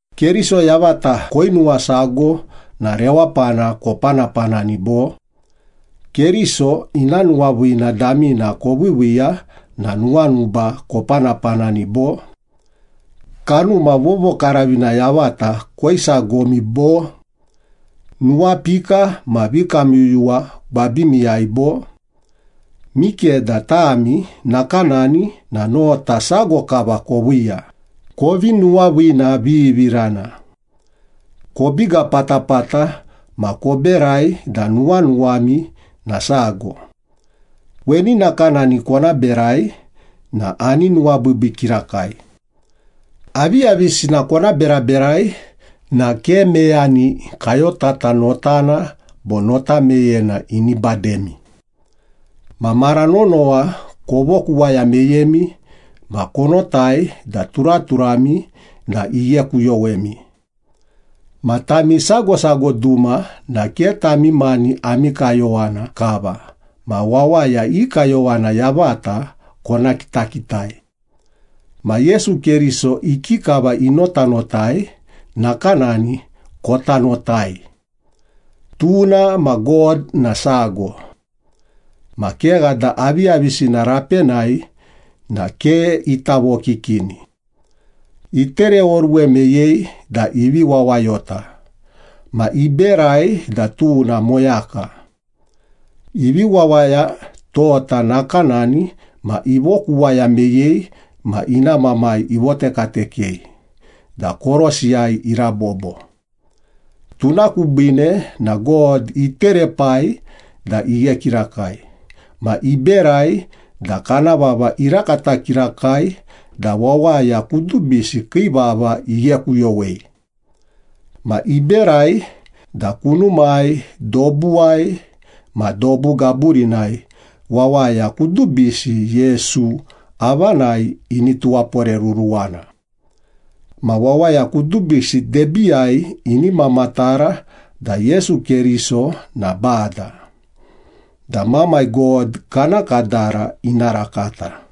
Keriso yavata koinuwasago na rewapana kopanapanani, bo? Keriso ina nuwaviina damina koviiviiya na nuwanuba kopanapanani, bo? Kanuma Vovokaravina yavata koisagomi, bo? Nuwapika ma vikamyuyuwa gwabimiyai, bo? Mikeda tami nakanani na nota sago kava koviiya, kovi nuwaviinavivirana. Kobiga patapata ma koberai da nuwanuwami na sago. Weni nakanani kona berai na ani nuwabiibii kirakai. Aviyavisina kona beraberai na ke meyani kayotata notana bo nota meyena ini bademi. Ma mara nonowa kovokuwaya meyemi ma konotai da turaturami na ighekuyowemi. Ma tami sago sago duma na ke tami mani ami kayowana kava ma wawaya i kayowana yavata kona kitakitai. Ma Yesu Keriso ikikava inotanotai, nakanani kota notai. Tuna ma God na sago. Ma kegha da aviyavisina rapenai na ke ita vokikini. Itereoruwe meyei da ivi wawayota ma iberai da tuna moyaka. Ivi wawaya tota nakanani ma ivokuwaya meyei ma ina Mamai ivotekatekei da korosiyai irabobo. Tuna kubiine na God iterepai da ighe kirakai ma iberai da kana vava irakata kirakai da wawaya kudubisi kii vava ighekuyowei. Ma iberai da kunumai, dobuwai ma dobu gaburinai wawaya kudubisi Yesu avanai ini tuwaporeruruwana. Ma wawaya kudubisi debiiyai ini mamatara da Yesu Keriso na Bada da Mamai God kana kadara ina rakata.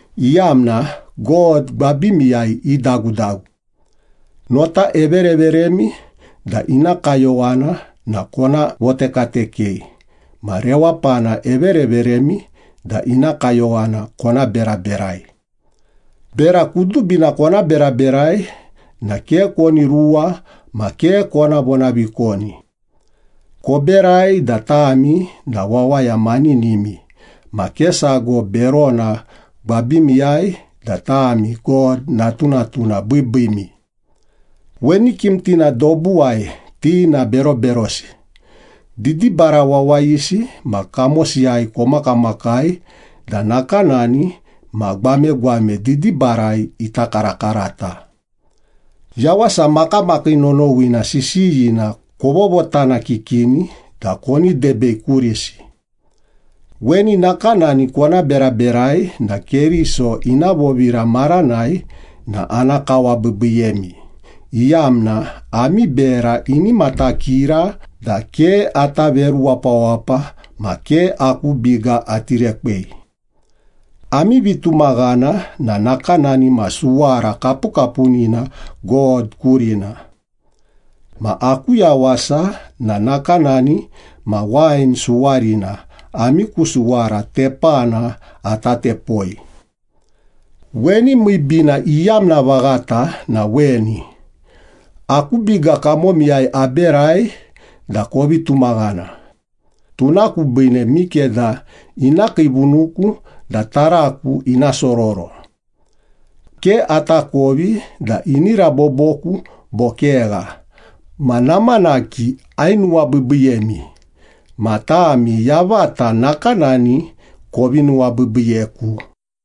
iyamna God gwabimiyai idagudagu. Nota evereveremi da ina kayowana na kona votekatekei ma rewapana evereveremi da ina kayowana kona beraberai. Bera kudubina kona beraberai na ke koni ruwa ma ke kona vonavikoni. Koberai da tami na wawaya maninimi ma ke sago berona gwabimiyai da tami God natunatuna biibiimi. Weni kimtina dobuwai ti na beroberosi, didibara wawayisi ma kamosiyai komakamakai da nakanani ma gwamegwame didibarai ita karakarata. Yawasa makamakii nonowina sisiyina kovotanakikini da koni debei kurisi. Weni nakanani kona beraberai na Keriso ina vovira maranai na ana kawabiibiiyemi, iyamna ami bera ini matakira da ke ata veru wapawapa ma ke aku biga ati rekwei. Ami vitumaghana na nakanani ma suwara kapukapunina God kurina. Ma aku yawasa na nakanani ma wain suwarina ami ku suwara tepana ata tepoi. Weni miibiina iyamna vaghata na weni, aku biga kamomiyai aberai da kovi tumaghana, tuna kubiine mikeda ina kiivunuku da taraku ina sororo. Ke atakovi da ini raboboku bo kegha, ma namanaki, ainuwabiibiiyemi, ma tami yavata nakanani kovi nuwabiibiiyeku.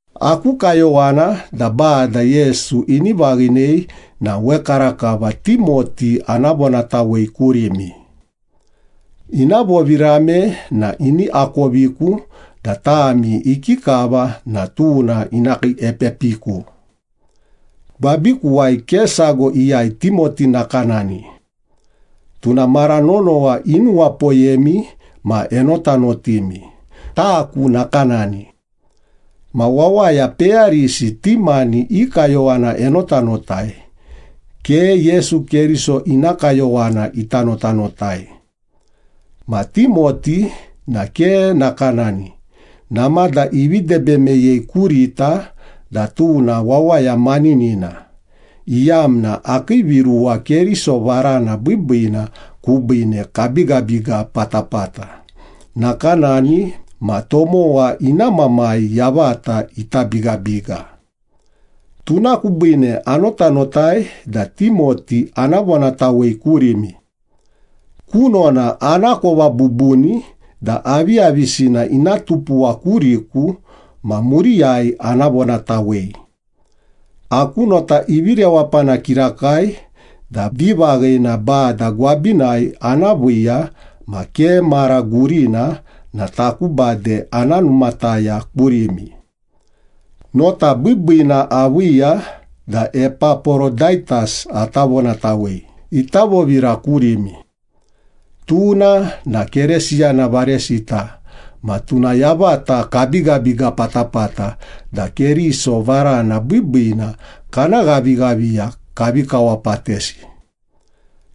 Aku kayowana da Bada Yesu ini vaghinei na wekarakava Timoti ana vonatawei kurimi. Ina vovirame na ini akoviku da tami ikikava na tuna ina kiiepepiku. Gwabikuwai ke sago iyai Timoti nakanani. Tuna mara nonowa inuwapoyemi ma enotanotimi, taku nakanani. Ma wawaya peyarisi ti mani i kayowana enotanotai, ke Yesu Keriso ina kayowana ita notanotai. Ma Timoti na ke nakanani, namada ivi debe meyei kurita da tuna wawaya maninina, iyamna akii viruwa Keriso varana biibiina kubiine kabigabiga patapata, nakanani ma tomowa ina mamai yavata ita bigabiga. Tuna kubiine anotanotai da Timoti ana vonatawei kurimi. Kunona anakova bubuni da aviyavisina ina tupuwa kuriku ma muriyai ana vonatawei. Aku nota ivi rewapana kirakai da vivaghina Bada gwabinai ana viiya ma ke mara gurina na taku bade ana numataya kurimi. Nota biibiina aviiya da Epaporodaitas ata vonatawei ita vovira kurimi. Tuna na Keresiyana varesita ma tuna yavata kabigabiga patapata da Keriso varana biibiina kana ghavighaviya kavi kawapatesi.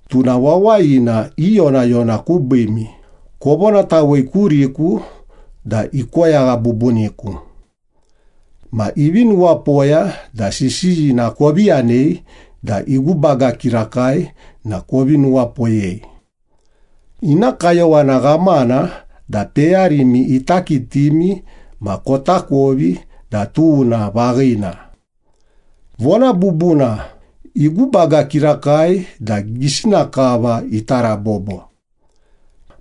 Tuna wawayina iyonayona kubiimi, kovonatawei kuriku da ikoyagha bubuniku. Ma ivi nuwapoya da sisiyina kovi yanei da igubaga kirakai na kovi nuwapoyei. Ina kayowana ghamana da peyarimi ita kitimi ma kotakovi da tuna vaghina. Vona bubuna, igubaga kirakai da gisina kava ita rabobo.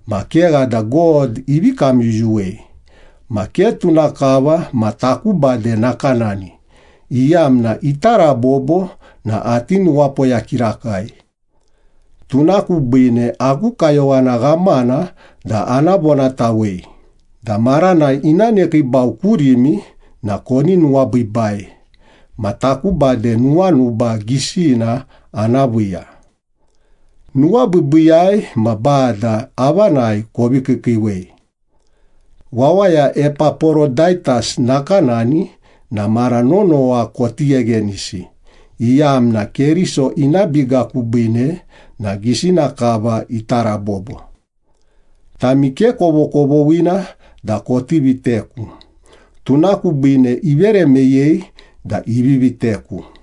Ma kegha da God ivi kamyuyuwei, ma ke tuna kava ma taku bade nakanani, iyamna ita rabobo na ati nuwapoya kirakai. Tuna kubiine aku kayowana ghamana da ana vonatawei da maranai ina nekiibau kurimi na koni nuwabiibai, ma taku bade nuwanuba gisina ana viiya. Nuwabiibiiyai ma Bada avanai kovi kiikiiwei. Wawaya Epaporodaitas nakanani na mara nonowa koti gheghenisi, iyamna Keriso ina biga kubiine na gisina kava ita rabobo. Tami ke kovokovoghina da koti viteku, tuna kubiine ivere meyei da ivi viteku.